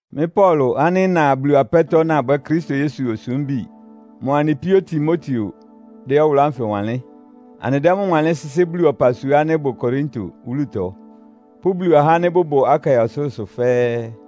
Mɩ́ Paulo ánɩ́ ɩna Bulu apɛ́tɔ́ nabwɛ́ Kristo Yesu sumbí ɔyɔpʋ́ mʋa anɩ píó Timoteo dɛ́ ɔwʋlʋ́ ánfɩ wanlɩ́n. Anɩdɛ́ mʋ́ wanlɩ́n sɩ́sɩ́ Bulu ɔpasua ánɩ́ ɩbʋ Korinto wúlutɔ pʋ́ Bulu ahá ánɩ́ bʋbʋ Akaia ɔsʋlʋ́sʋ fɛ́ɛ́.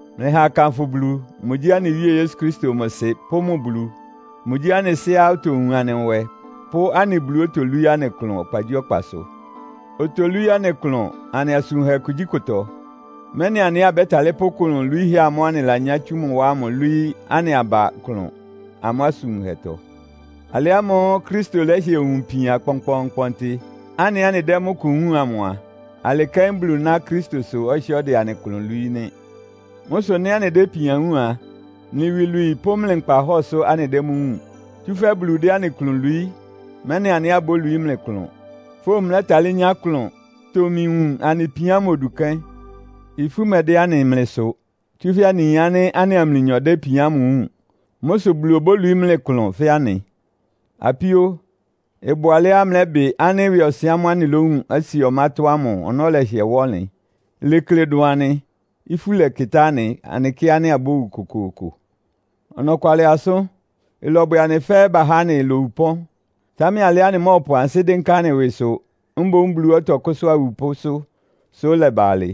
Mlɩha akanfʋ Bulu. Mʋgyí anɩ Wíe Yesu Kristo mʋ Sɩ pʋ́ mʋ Bulu. Mʋgyí anɩ Sɩ́á otowun anɩ nwɛ pʋ́ anɩ Buluá otolwíí anɩ klʋn ɔkpagyíɔkpasʋ! Otolwíí anɩ klʋn anɩ asʋn wunhɛ kugyíkʋtɔ, mɛ́nɩ anɩ ɛ́ abɛ́talɩ́ pʋ́ klʋn lwiíhɛ́ ámʋ́ʋ́ anɩlanyá tsú mʋ wá ámʋ lwíí anɩ aba klʋn amʋ́ asʋn wunhɛtɔ. Alɩ ámʋ́ʋ́ Kristo lɛ́hɩɛ wun ipian kpɔnkpɔɔnkpɔntɩ, anɩ ɛ́ anɩdɛ́ mʋ́ kʋ wúun amʋ a, alɩ́ kɛ́n Bulu ná Kristosʋ ɔhɩ́ɛ́ ɔdɛ anɩ klʋn lwií nɩ́. Mʋ́ sʋ nɩ́ anɩdɛ́ ipian wúun a, mlɩ iwilwii pʋ́ mlɩ nkpahɔ́ɔ sʋ anɩdɛ́ mʋ́ wúun. Tsúfɛ́ Bulu dɛ́ anɩ klʋn lwií, mɛ́nɩ anɩ ɛ́ abólwií mlɩ klʋn, fówun mlɛ́talɩ́ nyá klʋn, tomi wun anɩ ipian ámʋ odu kɛ́n. Ifú mɛdɛ́ anɩ mlɩ sʋ, tsúfɛ́ anɩyin ánɩ́ anɩa mlɩnyɔ dɛ́ ipian ámʋ wúun. Mʋ́ sʋ Bulu obólwií mlɩ klʋn fɛ́ anɩ. Apíó, ɩbʋ alɛ́á mlɛ́bɩ ánɩ́ ɩwɩɔsɩn ámʋ́ʋ́ anɩlówun Asia ɔmátɔ́ ámʋ ɔnɔ́ lɛhɩɛ wá ɔnlɩn. Ilekle dʋn anɩ. Ifú lɛkɩtá anɩ, anɩkɩ́ ánɩ́ abówu kokooko. Ɔnɔkwalɩ asʋ́n, ɩlɔbwɛ anɩ fɛ́ bahá anɩ lowu ɩpɔ́n. Támɛ alɩá anɩmɔ́ɔpʋ ansɩ́ dɩ́nká anɩ ɩwɩsʋ, mboún Buluá ɔtɔkʋ́sʋ́a awupʋ́sʋ́, sʋ ɩlɛba alɩ.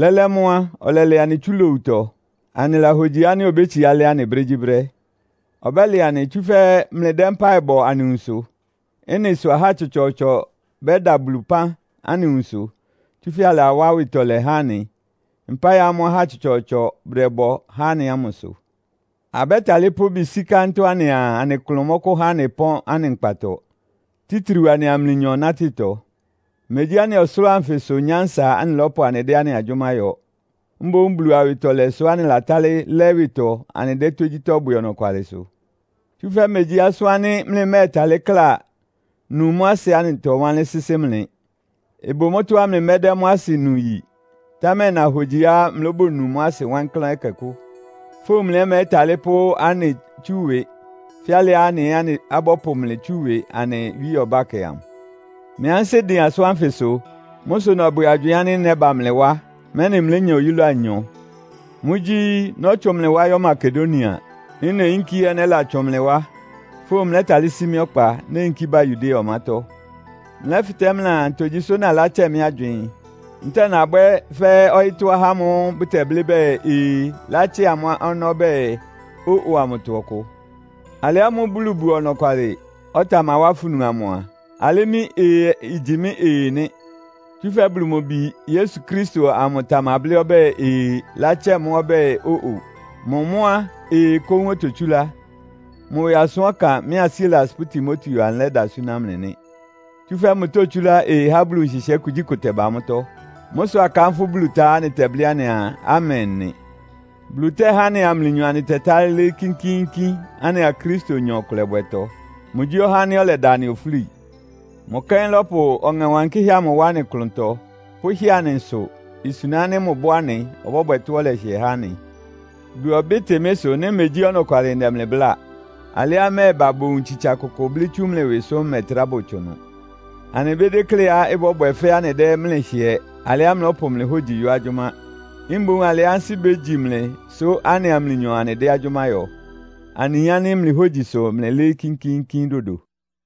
Lɛ́lɛ́ mʋ́ á, ɔlɛlɛ anɩ tsú lowutɔ. Anɩlahogyi ánɩ́ obétsiá lɛ́ anɩ brégyíbrɛ́. Ɔbɛ́lɛ anɩ, tsúfɛ́ mlɩdɛ́ mpáɩ bɔ anɩ nwunsʋ. Ɩ́nɩ sʋ ahá tsɔtsɔɔtsɔ bɛ́da Bulu ɩpán anɩ nwunsʋ, tsúfɛ́ alawá awɩtɔlɛ há anɩ, mpáɩ ámʋ́ʋ́ ahá tsɔtsɔɔtsɔ bʋdɛbɔ há anɩ ámʋ sʋ. Abɛ́talɩ́ pʋ́ ɩbɩ sí kántɔ́ anɩaa anɩ klʋn mɔ́kʋ́há anɩ pɔ́n anɩ nkpatɔ, títriu anɩa mlɩnyɔ nátɩtɔ. Megyí anɩ ɔsʋlʋ́ʋ anfɩsʋ nyánsa anɩlɔ́pʋ anɩdɛ́ anɩ agyʋ́má yɔ, mboún Bulu awɩtɔlɛ sʋ́ anɩlatálɩ́ lɛ́ ɩwɩtɔ anɩdɛ́ tógyítɔ́ bwɛ ɔnɔkwalɩsʋ. Tsúfɛ́ megyí asʋ́n ánɩ́ mlɩmɛ́ɛtalɩ́ kla, nu mʋ́ asɩ anɩtɔwánlɩ́n sɩ́sɩ́ mlɩ. Ɩbʋ mʋ́tɔ́á mlɩmɛ́dɛ́ mʋ́ asɩ nu yi, támɛ nahogyiá mlóbonu mʋ́ asɩ wankláán ɛkɛkʋ́. Fówun mlɩ ɛ́ mlɛ́talɩ́ pʋ́ anɩ tsú ɩwɩ, fɛ́ alɩá anɩ ɛ́ abɔ́pʋ mlɩ tsú ɩwɩ anɩ Wíe ɔbákɛ amʋ. Mɩ́ ansɩ́ dɩn asʋ́n ánfɩsʋ. Mʋ́ sʋ nɔbwɛ agywɩɩn ánɩ́ nɛ́ba mlɩ wá, mɛ́nɩ mlénya oyúla anyɔ. Mʋ́gyí, nɔ́tsʋn mlɩ wá yɔ́ Makedonia. Nɩ́ neyínkí ɛ́ nɛ́latsʋn mlɩ wá; fówun mlɛ́talɩ́ sí mɩ́ ɔkpa, néyinkí ba Yudea ɔmátɔ́. Mlɛ́fɩtɛ́ mlɩaa, ntogyi sʋ́ nalátsɛ mɩ́ agywɩɩn. Ntɛ́ɛ nabwɛ́ fɛ́ ɔyɩ́tɔ́ ahá ámʋ́ʋ́ bʋtɛblɩ́ bɛɛ, “Ee” latsɛ́ amʋ́ ɔnɔ́ bɛɛ “Ó-o” amʋtɔ ɔkʋ? Alɩ ámʋ́ʋ́ Bulu bʋ ɔnɔkwalɩ, ɔtamawá afunu amʋ a, alɩ́ mɩ́ “Ee” igyi mɩ́ “Ee” nɩ́. Tsúfɛ́ Bulu mʋ Bi Yesu Kristo amʋ tamablɩ́ ɔbɛ́ɛ “Ee” latsɛ́ mʋ́ ɔbɛ́ɛ “Ó-o.” Mʋ mʋ́ á, “Ee” kóún ototsúlá. Mʋ ɩwɩ asʋ́n ɔkan mɩ́a Silas pʋ́ Timoteo anɩlɛ́da súná mlɩ nɩ́. Tsúfɛ́ mʋtótsúlá “Ee” há Bulu nhɩhɩɛ́ kugyíkʋ ɩtɛba mʋ́tɔ́. Mʋ́ sʋ́ akánfʋ́ Bulu tá á, anɩtɛblɩ́ anɩaa, “Amen!” nɩ. Bulu tɛ́há anɩa mlɩnyɔ anɩtɛtálɩ́ lɩ́ɩ́ kínkíínkín anɩa Kristonyɔ ɩkʋlɛbwɛtɔ. Mʋgyí ɔhá ánɩ́ ɔlɛda anɩ ofúli. Mʋ kɛ́n lɔ́pʋ Ɔŋɛ Wankɩ́hɛ́ amʋ wá anɩ klʋntɔ, pʋ́hɩ́ɛ anɩ nsʋ; isuna ánɩ́ mʋbʋ́ anɩ, ɔbɔ́bwɛ tɔ́á ɔlɛhɩɛ há anɩ. Bulu ɔbɩ́tɩ mɩ́ ɩsʋ nɩ́ megyí ɔnɔkwalɩ ndɛ mlɩ bláa. Alɩá mmɛ́ɛba bowun tsitsa kʋkʋ blɩ́ tsú mlɩ ɩwɩ sʋ́ mmɛtrá bɔtsʋn ɩnʋ. Anɩmédékléá ɩbɔ́bwɛ fɛ́ anɩdɛ́ mlɩ hɩɛ alɩá mlɔ́pʋ mlɩ hógyi yɔ́ agyʋ́má. Mboún alɩá ansɩ́ bégyi mlɩ sʋ́ anɩa mlɩnyɔ anɩdɛ́ agyʋ́má yɔ. Anɩyin ánɩ́ mlɩ hógyi sʋ mlɩlɩ́ɩ́ kínkíínkín dodo.